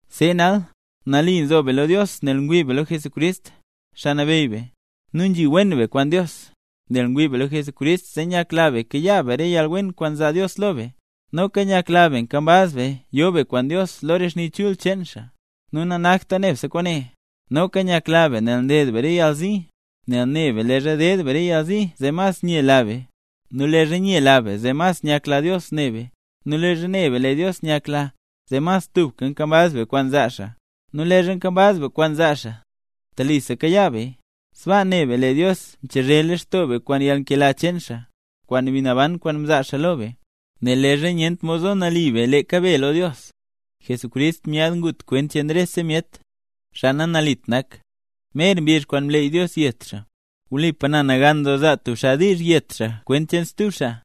See nal, nali nzo be lo Dios nel ngwii be lo Jesucrist, Xaa Nabeyy be; nu nzhi wen be kwaan Dios. Nel ngwii be lo Jesucrist zee nyakla be nkayaa be re yalwen kwaan nzaa Dios lo be, noka nyakla be nkambaz be yo be kwaan Dios lo xni chul doo cheen xaa. Nu nanakta nebse kwaane, noka nyakla be nel nded be re yalzi; nel ne be leezha ded be re yalzi zee mas nyela be. Nu leezha nyela be zee mas nyakla Dios ne be, nu leezha ne be lee Dios nyakla, zee mas tubka nkambaz be kwaan zaa xaa. Nu leezha nkambaz be kwaan zaa xaa, telisa kayaa beya. Sbaa ne be: Lee Dios mchezhe lextoo be kwaan yalnkela cheen xaa, kwaan Mbi Naban kwaan mzaa xaa lo be. Nel leezha nyent mod zo nali be leeka be lo Dios, Jesucrist myaad ngut kwent cheen rese myet, xaa nanalit nak, mer mbizh kwaan mleey Dios yet xaa. Wlipa na nagan doo zaa tub xaa diizh yet xaa kwent cheen stub xaa,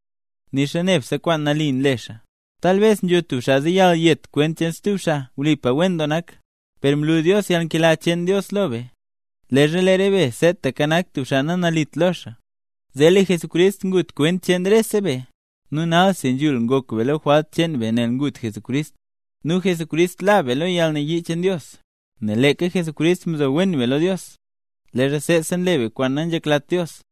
nixa nebse kwaan nali nle xaa. Talbes nzho tub xaa zeyal yet kwent cheen stub xaa, wlipa wen doo nak. Per mlu Dios yalnkela cheen Dios lo be, leezha lee re be seetaka nak tub xaa nanalit lo xaa, zee lee Jesucrist ngut kwent cheen rese be. Nu nalsi, nzhul ngok be lo re jwalt cheen be nel ngut Jesucrist, nu Jesucrist la be lo yalnayii cheen Dios. Nel leeka Jesucrist mzo wen be lo Dios, leezha seesa nle be kwaan nanzheklat Dios,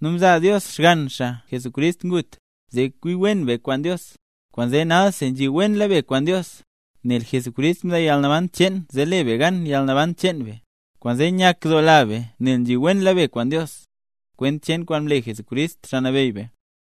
nu mzaa Dios Xgann xaa, Jesucrist, ngut, zee kwi wen be kwaan Dios. Kwaanzee nalsi nzhiwenla be kwaan Dios; nel Jesucrist mzaa yalnaban cheen, zee le be gan yalnaban cheen be. Nu kwaanzee nyakdoola be nel nzhi wenla be kwaan Dios, kwent cheen kwaan mle Jesucrist, Xaa Nabeyy be.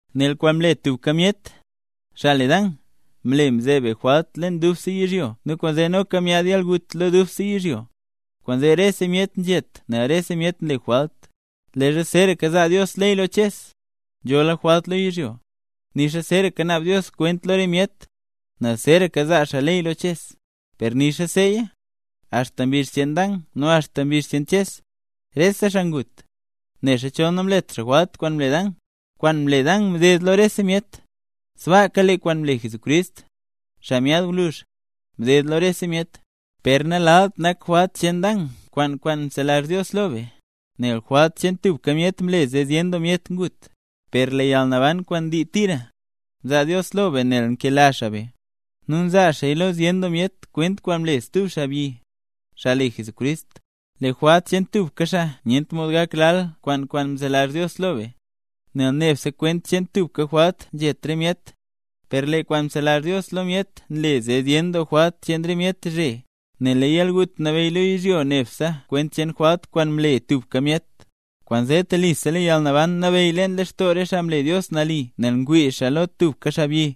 Nel kwaan mle tubka myet, xaa le Dan, mle zee mzeeb jwalt leen dubse yizhyo nu kwaanzee noka myaad yalgut lo dubse yizhyo; kwaanzee rese myet nzhet nel rese myet nle jwalt. Leezha zeeraka zaa Dios ley lo Ches, nzhola jwalt lo yizhyo; nixa zeeraka naab Dios kwent lo re myet, nel zeeraka zaa xaa ley lo Ches. Per nixa seeya, axta mbizh cheen Dan nu axta mbizh cheen Ches, rese xaa ngut, nexa chol namlet xaa jwalt kwaan mle Dan. Kwaan mle Dan mded lo rese myet, sbaaka lee kwaan mle Jesucrist, xaa myaad gwluzh, mded lo rese myet. Per nalalt nak jwalt cheen Dan kwaan kwaan mzelazh Dios lo be. Nel jwalt cheen tubka myet mle zee zyen doo myet ngut. Per lee yalnaban kwaan ndii tira, mzaa Dios lo be nel nkela xaa be, nu nzaa xaaya lo zyen doo myet kwent kwaan mle stub xaabyi, xaa le Jesucrist. Lee jwalt cheen tubka xaa nyent mod gak lal kwaan kwaan mzelazh Dios lo be, nel nebse kwent cheen tubka jwalt nzhet re myet, per lee kwaan mzelazh Dios lo myet nle zee zyen doo jwalt cheen re myet zhe. Nel lee yalgut nabeyy lo yizhyo nebse kwent cheen jwalt kwaan mle tubka myet; kwaanzee telisa lee yalnaban nabeyy leen lextoo re xaa mle Dios nali nel ngwii xaa lo tubka xaabyi,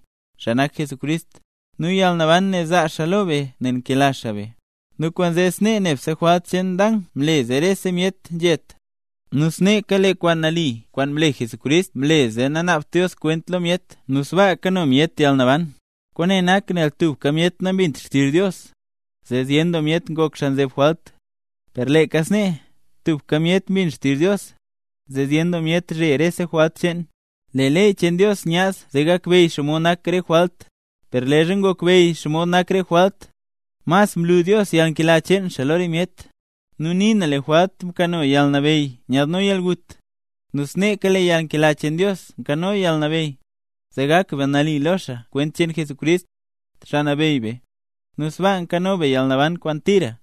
xaa nak Jesucrist. Nu yalnaban ne zaa xaa lo be nel nkela xaa be. Nu kwaanzee snee nebse jwalt cheen Dan mle zee rese myet nzhet, nu sneeka lee kwaan nali kwaan mle Jesucrist mle zee nanaabt Dios kwent lo myet, nu sbaa kano myet yalnaban. Kwaane nak, nel tubka myet nambint xtizh Dios, zee zyen doo myet ngok xaa nzeb jwalt; per leeka snee, tubka myet mbin xtizh Dios, zee zyen doo myet zhe rese jwalt cheen. Lee ley cheen Dios nyaad zee gakbeyy xaa xomod nak re jwalt. Per leezha ngokbeyy xaa xomod nak re jwalt, mas mlu Dios yalnkela cheen xaa lo re myet. Nu nii na lee jwalt mkano yalnabeyy nyaadno yalgut, nu sneeka lee yalnkela cheen Dios nkano yalnabeyy, zee gak be nali lo xaa kwent cheen Jesucrist, Xaa Nabeyy be, nu sbaa nkano be yalnaban kwaan tira.